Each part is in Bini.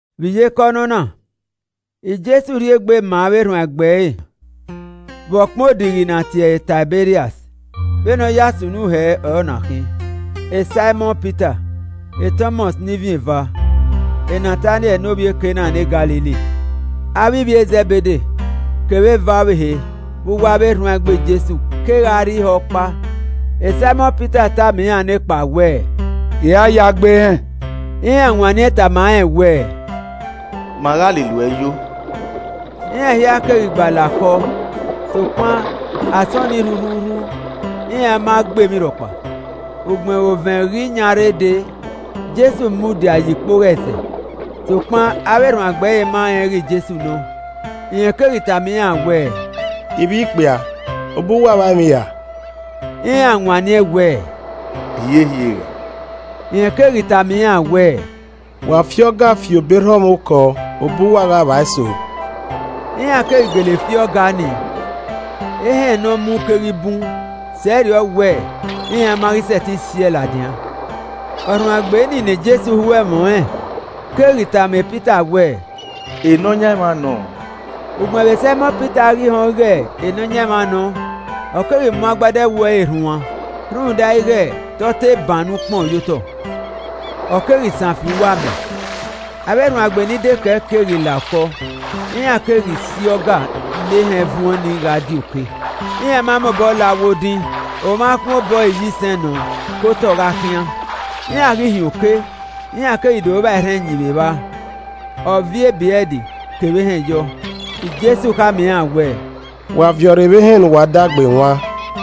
Vbe iyeke ọnọna, Jesu rhie egbe maa avbe erhuanegbe ẹre vbe ọkpẹn odighi ne a tie ẹre Taiberias. Vbene ọ ya sunu hẹ ọre ọna khin. Saimọn Pita, Tọmọs, (ne Ivin eva), Nataniẹl (ne ovbi e Kana ne Galili), avbe ivbi Zẹbede kevbe eva ọvbehe vbe uwu avbe erhuanegbe Jesu kegha rre ihe ọkpa. Saimọn Pita tama iran nekpa wẹẹ, “I ra ya gbe ehẹn.” Iran wanniẹn tama rẹn wẹẹ, “Ma gha lele uẹ yo.” Iran hia keghi gba la okọ, sokpan, asọn ni rhurhuurhu, iran ma gbe emwi rhọkpa. Ugbẹn vbe ovẹn ghi yan rre dee, Jesu mudia ye ikpogho ẹzẹ, sokpan avbe erhuanegbe ma rẹn ighẹ Jesu nọ. Rẹn keghi tama iran wẹẹ, “Ivbi ikpia, obọ uwa vba emwi ra?” Iran wanniẹn wẹẹ, “Hiehie re.” Rẹn keghi tama iran wẹẹ, “Wa fi ọga fi obọ erha ọmwa okọ, obọ uwa gha vba eso.” Iran keghi gele fi ọga nii, ehẹn ne ọ mu keghi bun sẹrriọ wẹ iran ma ghi sẹtin si ẹe ladian. Ọrhuanegbe nii ne Jesu ho ẹmwẹ ọnrẹn keghi tama Pita wẹ, “Nọyaẹnmwa nọ!” Ugbẹn vbe Saimọn Pita ghi họn ighẹ Nọyaẹnmwa nọ ọ keghi mu agbada ẹwu ẹre rhuan (rhunmwuda ighẹ te ọ te bannọ ukpọn ye otọ,) ọ keghi san fi uwu amẹ. Avbe erhuanegbe ni dekẹe keghi la okọ, iran keghi si ọga ne ehẹn vuọẹn nii gha die oke. Iran ma mobọ la uwu odin, omwa akhuẹn obọ iyisẹn nọ ke otọ gha khian. Iran ghi hin oke, iran keghi do vba erhẹn ẹyin vbe evba, a viọ ebrẹd kevbe ehẹn yọ. Jesu khama iran wẹẹ, “Wa viọ rre vbe ehẹn ne uwa da gbe wan.”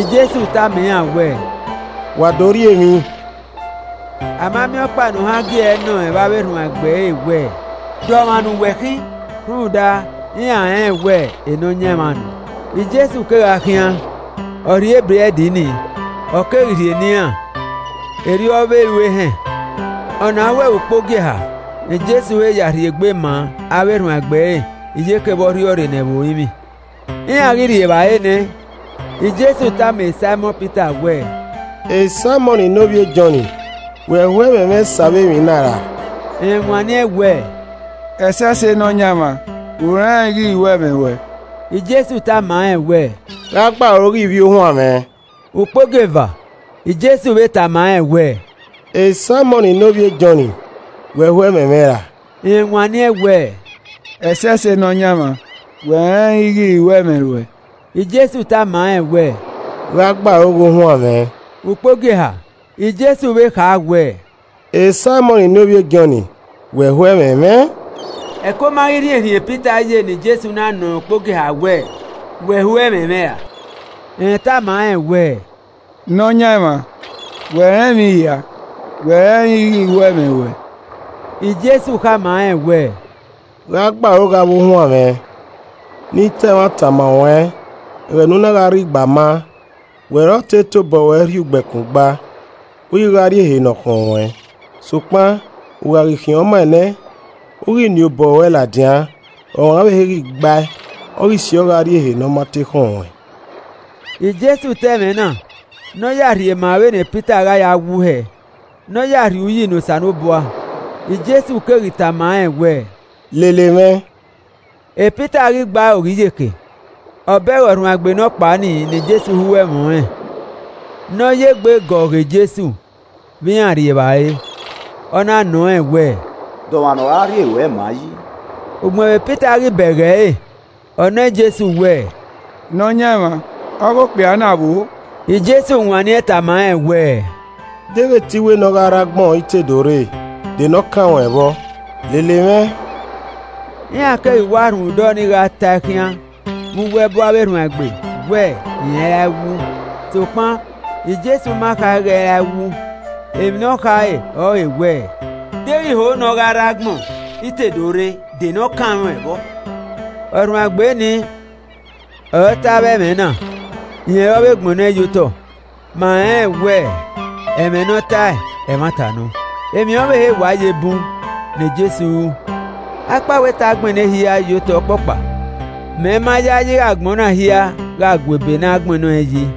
Jesu tama iran wẹẹ, “Wa do rri emwi.” A ma miẹn ọkpa ne ohan gi ẹe nọ rẹn vbe uwu avbe erhuanegbe ẹre wẹ, “De ọmwa ne uwẹ khin?” Rhunmwuda iran rẹnrẹn wẹ Nọyaẹnmwa nọ. Jesu kegha khian, ọ rhie ebrẹd ni, ọ keghi rhie ne iran, erriọ ọre ọ vbe ru ehẹn. Ọna ọrọre ukpogieha ne Jesu he rhie egbe maa avbe erhuanegbe ẹre, iyeke vbe ọ rhiọrre nẹ vbe orinmwi. Iran ghi rri evbare nẹ, Jesu tama Saimọn Pita wẹẹ, “Saimọn ne ovbi e Jọn, wẹ ho ẹmwẹ mwẹ sẹ avbe emwi na ra?” Rẹn wanniẹn wẹẹ, “Ẹsẹse Nọyaẹnmwa, U rẹnrẹn ighẹ I ho ẹmwẹ ruẹn.” Jesu tama rẹn wẹ, “Gha gbe aro ghe ivbi ohuan mwẹ.” Ukpogieva, Jesu vbe tama rẹn wẹ, “Saimọn ne ovbi e Jọn, wẹ ho ẹmwẹ mwẹ ra?” Rẹn wanniẹn wẹẹ, “Ẹsẹse Nọyaẹnmwa, wẹ rẹnrẹn ighẹ I ho ẹmwẹ ruẹn.” Jesu tama rẹn wẹ, “Gha gbe aro ghe ohuan mwẹ.” Ukpogieha, Jesu vbe kha wẹẹ, “Saimọn ne ovbi e Jọn, wẹ ho ẹmwẹ mwẹ?” Ẹko ma ghi rhiẹnrhiẹn e Pita ye ne Jesu na nọ rẹn ukpogieha wẹẹ, “wẹ ho ẹmwẹ mwẹ ra?” Rẹn tama rẹn wẹẹ, “Nọyaẹnmwa, wẹ rẹn emwi hia, wẹ rẹnrẹn ighẹ I ho ẹmwẹ ruẹn.” Jesu khama rẹn wẹ, “Gha gbe aro ghe avbe ohuan mwẹ. Ne I te ẹmwata ma ruẹn, ẹghẹ ne u na gha rre igbama, wẹ ọre ọ te tobọ ruẹ rhie ugbẹkun gba, u ghi gha rrie ehe ne ọ khọn ruẹn. Sokpan, u gha ghi khian ọmaẹn nẹ, u ghi nien obọ ruẹ ladian, ọmwa ọvbehe ghi gba ẹe, ọ ghi siọ gha rrie ehe ne ọ ma te khọn ruẹn.” (Jesu ta ẹmwẹ na, ne ọ ya rhie maa vbene Pita gha ya wu hẹ, ne ọ ya rhie uyi ne Osanobua) Jesu keghi tama rẹn wẹẹ, “Lele mwẹ!” Pita ghi gbe aro ghe iyeke, ọ bẹghe ọrhuanegbe nọkpa ni ne Jesu ho ẹmwẹ ọnrẹn, ne ọ ye egbe gọ yan Jesu vbe iran rri evbare, ọ na nọ rẹn wẹ, “De ọmwa nọ ra rhie ruẹ ma an yi?” Ugbẹn vbe Pita ghi bẹghe ẹre, ọ nọ Jesu wẹẹ, “Nọyaẹnmwa, ọghe okpia na vbo o?” Jesu wanniẹn tama rẹn wẹẹ, “Deghẹ te I wẹ ne ọ gha rre agbọn I te do rre, de ne ọ kan ruẹn vbọ? Lele mwẹ.” Iran keghi wa rhunmwuda ọnii gha ta ẹe khian vbe uwu ẹbu avbe erhuanegbe wẹ rẹn i ra wu: Sokpan Jesu ma kha ighẹ ẹ i ra wu, emwi ne ọ khare ọre wẹ, “Deghẹ I ho ne ọ gha rre agbọn I te do rre, de ne ọ kan ruẹn vbọ?” Ọrhuanegbe ni ọre ọ ta avbe ẹmwẹ na, rẹn ọre ọ vbe gbẹnnẹ ọẹn ye otọ, ma rẹnrẹn wẹ ẹmwẹ ne ọ tae, ẹmwata nọ. Emwi ọvbehe wa ye bun ne Jesu ru. Akpawẹ te a gbẹnnẹ ehia ye otọ ọkpọkpa, mẹ ma yayi ighẹ agbọn na hia gha gua ebe ne a gbẹnnẹ ọẹn yi.